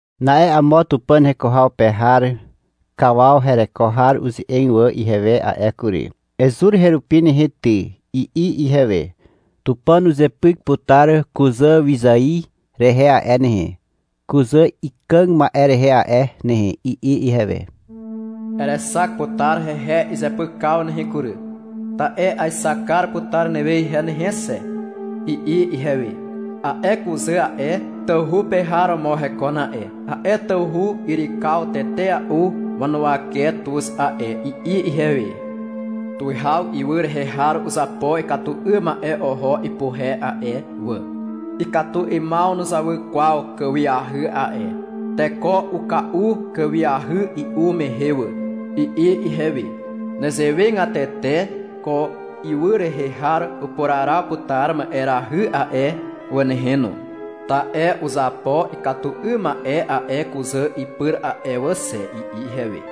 Na'e amo Tupàn heko haw pe har kawaw hereko har uze'eg wà ihewe a'e kury. — Ezur herupi nehe ty, i'i ihewe. — Tupàn uzepyk putar kuzàwyzài rehe a'e nehe, kuzà ikàg ma'e rehe a'e nehe, i'i ihewe. — Erexak putar hehe izepykaw nehe kury, ta'e aexak kar putar newe ihe nehe xe, i'i ihewe. — A'e kuzà a'e, tawhu pe har romo hekon a'e. A'e tawhu yrykaw tetea'u wanuwake tuz a'e, i'i ihewe. — Tuwihaw ywy rehe har uzapo ikatu 'ym ma'e oho ipuhe a'e wà. Ikatu 'ymaw nuzawy kwaw kàwiahy a'e. Teko uka'u kàwiahy i'u mehe wà, i'i ihewe. (-Nezewegatete ko ywy rehe har upuraraw putar ma'erahy a'e wà nehe no, ta'e uzapo ikatu 'ym ma'e a'e kuzà ipyr a'e wà xe, i'i ihewe.)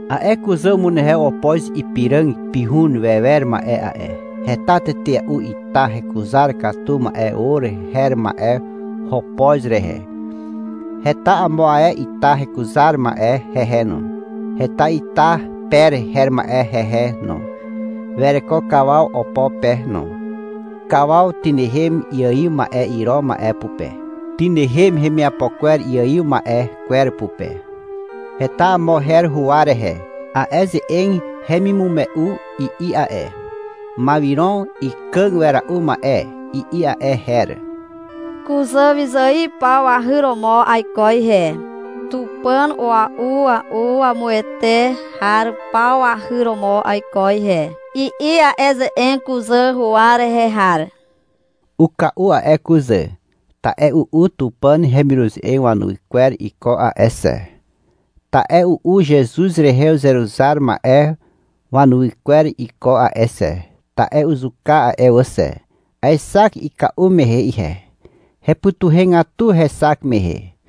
A'e kuzà umunehew opoz ipiràg pihun wewer ma'e a'e. Heta tetea'u ita hekuzar katu ma'e or her ma'e hopoz rehe. Heta amo ae ita hekuzar ma'e hehe no. Heta ita per her ma'e hehe no. Wereko kawaw opo pe no. Kawaw tynehem iaiw ma'e iro ma'e pupe. Tynehem hemiapo kwer iaiw ma'e kwer pupe. Heta amo her huwa rehe. A'e ze'eg hemimume'u i'i a'e. — Mawiron ikàg wera'u ma'e, i'i a'e her. — Kuzà wyzài paw wahy romo aiko ihe, tupàn a'ua'u wamuwete har paw wahy romo aiko ihe, i'i a'e ze'eg kuzà huwa rehe har. Uka'u a'e kuzà, ta'e u'u Tupàn hemiruze'eg wanuwy kwer iko a'e xe, ta'e u'u Zezuz rehe uzeruzar ma'e wanuwy kwer iko a'e xe, ta'e uzuka a'e wà xe. Aexak ika'u mehe ihe. Hepytuhegatu hexak mehe.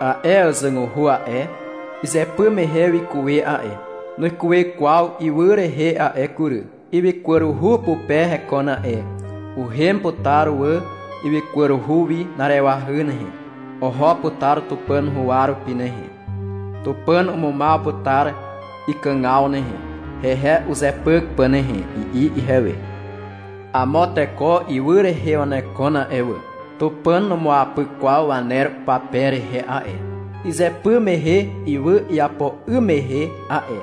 — A'e àzàguhu a'e, izypy mehe wikuwe a'e. Nuikuwe kwaw ywy rehe a'e kury. Ywykwaruhu pupe hekon a'e. Uhem putar wà ywykwaruhu wi na'arewahy nehe. Oho putar Tupàn huwa rupi nehe. Tupàn umumaw putar ikàgaw nehe, hehe uzepyk pà nehe, i'i ihewe. — Amo teko ywy rehe wanekon a'e wà. Tupàn numuapyk kwaw waner upape rehe a'e, izypy mehe ywy iapo 'ym mehe a'e.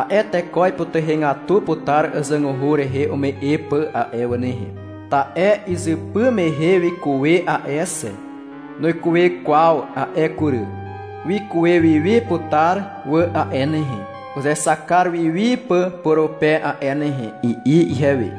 A'e teko ipytuhegatu putar àzàguhu rehe ume'e pà a'e wà nehe. Ta'e izypy mehe wikuwe a'e xe. Nuikuwe kwaw a'e kury. Wikuwe wi wi putar wà a'e nehe, uzexak kar wi wi pà purupe a'e nehe, i'i ihewe.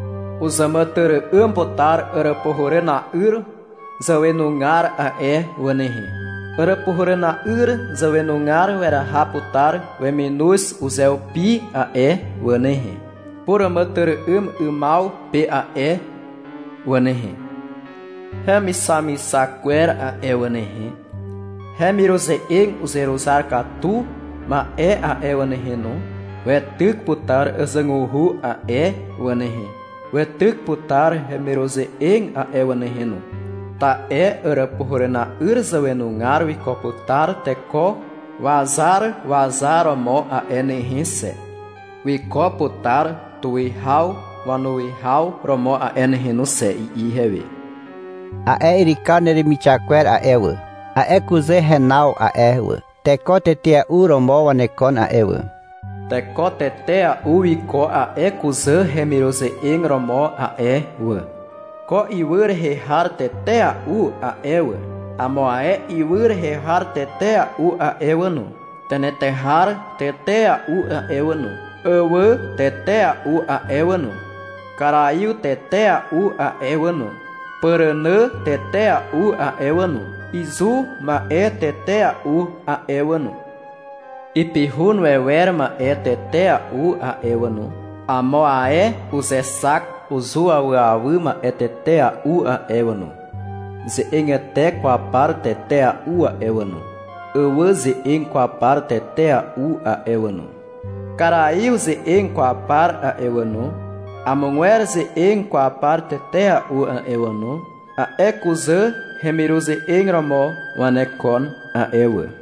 Uzàmàtyry'ym putar Àràpuhàràna'yr zàwenugar a'e wà nehe. Àràpuhàràna'yr zàwenugar weraha putar weminoz uzeupi a'e wà nehe, puràmàtyry'ymaw pe a'e wà nehe. Hemixamixak kwer a'e wà nehe, hemiruze'eg uzeruzar katu ma'e a'e wà nehe no, weityk putar àzàguhu a'e wà nehe, weityk putar hemiruze'eg a'e wà nehe no, ta'e Àràpuhàràna'yr zàwenugar wiko putar teko wazar wazar romo a'e nehe xe, wiko putar tuwihaw wanuwihaw romo a'e nehe no xe, i'i ihewe. — A'e yrykaw neremixak kwer a'e wà, a'e kuzà henaw a'e wà, teko tetea'u romo wanekon a'e wà. Teko tetea'u wiko a'e kuzà hemiruze'eg romo a'e wà. Ko ywy rehe har tetea'u a'e wà, amo ae ywy rehe har tetea'u a'e wà no, tenetehar tetea'u a'e wà no, àwà tetea'u a'e wà no, karaiw tetea'u a'e wà no, pàrànà tetea'u a'e wà no, izu ma'e tetea'u a'e wà no, ipihun wewer ma'e tetea'u a'e wà no, amo ae uzexak uzuawyawy ma'e tetea'u a'e wà no, ze'egete kwaw par tetea'u a'e wà no, àwà ze'eg kwaw par tetea'u a'e wà no, karaiw ze'eg kwaw par a'e wà no, amogwer ze'eg kwaw par tetea'u a'e wà no, a'e kuzà hemiruze'eg romo wanekon a'e wà.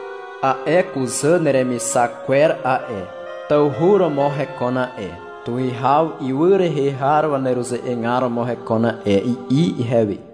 — A'e kuzà neremixak kwer a'e, tawhu romo hekon a'e, tuwihaw ywy rehe har waneruze'egar romo hekon a'e, i'i ihewe.